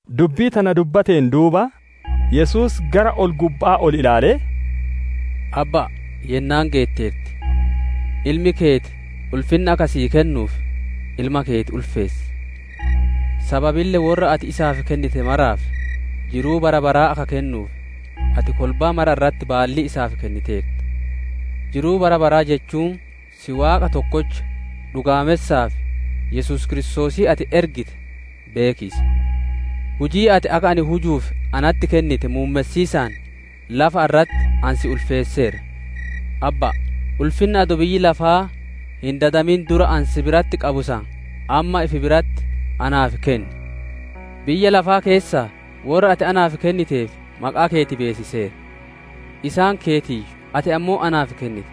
Dubbii tana dubbateen duuba, Yesuus gara ol-gubba'aa ol ilaalee, «Abba'a, yennaan geetteerti. Ilmi keeti ulfinna akka sii kennuuf, Ilma keeti ulfeessi. Sababille worra ati isaaf kennite maraaf, jiruu bara baraa akka kennuuf, ati kolbaa mara irratti baallii isaaf kenniteerta. Jiruu bara baraa jechuun si Waaqa tokkocha dhugaamessaa fi Yesuus Kiristoosii ati ergite beekiisa. Hujii ati akka ani hujuuf natti kennite muummessiisaan lafa irratti ani si ulfeesseera. Abba'a! Ulfinnuma adoo biyyi lafaa hin dadamin dura ani si biratti qabu san, amma ifi biratti naaf kenni. «Biyya lafaa keessaa worra ati naaf kenniteef maqaa keeti beessiseera. Isaan keetiiyyu, ati ammoo naaf kennite.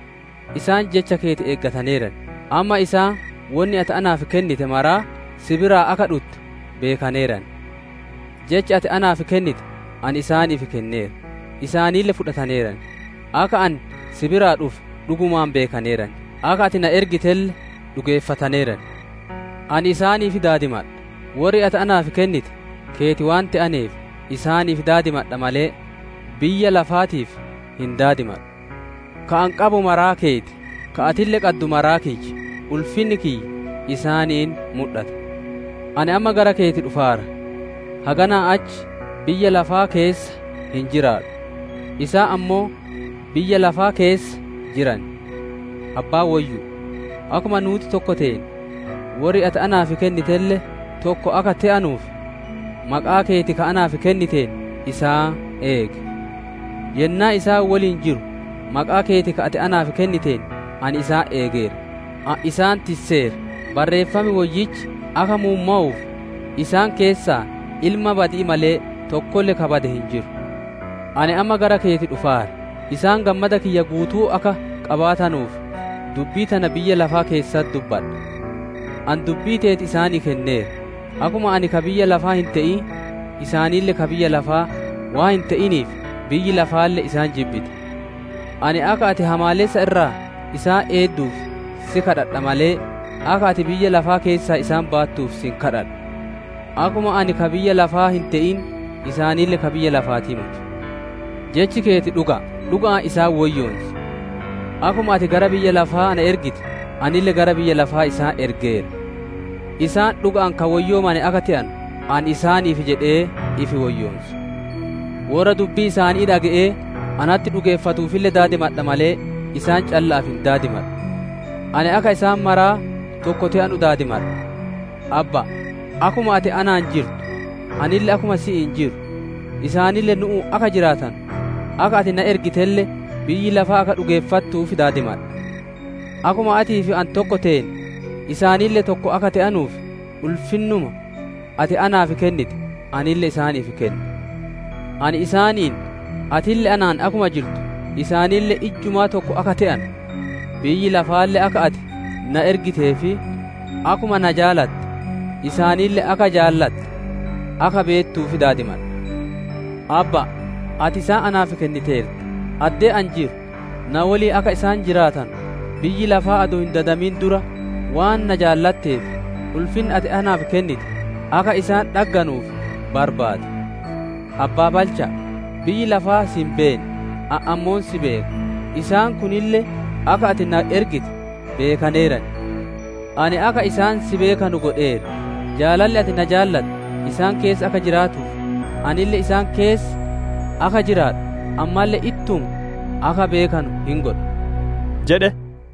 Isaan jecha keeti eegataneeran; amma isaan wonni ati naaf kennite maraa si biraa akka dhutte beekaneeran. Jecha ati naaf kennite ani isaaniif kenneera; isaanille fudhataneeran; akka ani si biraa dhufe dhugumaan beekaneeran; akka ati na ergitelle dhugeeffataneeran. «Ani isaaniif daadimadha; worri ati naaf kennite keeti waan te'aneef, isaaniif daadimadha malee, biyya lafaatiif hin daadimadhu. Ka ani qabu maraa keeti, ka atille qaddu maraa kiyya; ulfinni kiyya isaaniin mudhata. Ani amma gara keeti dhufaara; haganaa achi biyya lafaa keessa hin jiraadhu; isaan ammoo biyya lafaa keessa jiran. Abbaa woyyu'u! Akkuma nuuti tokko teene, worri ati naaf kennitelle tokko akka te'anuuf, maqaa keeti ka anaaf kenniteen, isaan eegi. Yennaa isaan woliin jiru, maqaa keeti ka ati naaf kenniteen ani isaan eegeera; ani isaan tisseera; Barreeffam Woyyichi akka muummowuuf, isaan keessaa ilma badi'ii malee, tokkolle ka bade hin jiru. Ani amma gara keeti dhufaara; isaan gammada kiyya guutuu akka qabaatanuuf, dubbii tana biyya lafaa keessatti dubbadha. Ani dubbii teeti isaanii kenneera; akkuma ani ka biyya lafaa hin te'in, isaanille ka biyya lafaa waan hin te'iniif, biyyi lafaalle isaan jibbite. Ani akka ati hamaalessa irraa isaan eedduuf si gaafadha malee, akka ati biyya lafaa keessaa isaan baattuuf si hin gaafadhu. Akkuma ani ka biyya lafaa hin te'in, isaanille ka biyya lafaatii moti. Jechi keeti dhuga'a; dhuga'aan isaan woyyoonsi. Akkuma ati gara biyya lafaa ana ergite, anille gara biyya lafaa isaan ergeera. Isaan dhuga'aan ka woyyoomane akka te'anu, ani isaaniif jedhee ifi woyyoonsa. «Worra dubbii isaanii dhage'ee natti dhugeeffatuufille gaafadha malee, isaan calla'aaf hin gaafadhu. Ani akka isaan maraa tokko te'anu daadimadha. Abba'a! Akkuma ati anaan jirtu anille akkuma si'iin jiru, isaanille nu'uun akka jiraatanu, akka ati na ergitelle biyyi lafaa akka dhugeeffattuuf daadimadha. Akkuma atii fi ani tokko teene, isaanille tokko akka te'anuuf, ulfinnuma ati naaf kennite, anille isaaniif kenne. Ani isaaniin, atille anaan akkuma jirtu, isaanille ijjumaa tokko akka te'anu, biyyi lafaalle akka ati na ergitee fi akkuma na jaalatte, isaanille akka jaalatte akka beettuuf daadimadha. «Abba'a! Ati isaan naaf kenniteerta; addee ani jiru na woliin akka isaan jiraatanu, biyyi lafaa adoo hin dadamin dura waan na jaalatteef, ulfinna ati naaf kennite, akka isaan dhagganuuf barbaada. Abbaa balcha'a! Biyyi lafaa si hin beenne; ani ammoo si beeka; isaan kunille akka ati na ergite beekaneeran. Ani akka isaan si beekanu godheera; jaalalli ati na jaalatte isaan keessa akka jiraatuuf, anille isaan keessa akka jiraadhu, ammalle ittuma akka beekanu hin godha» jedhe.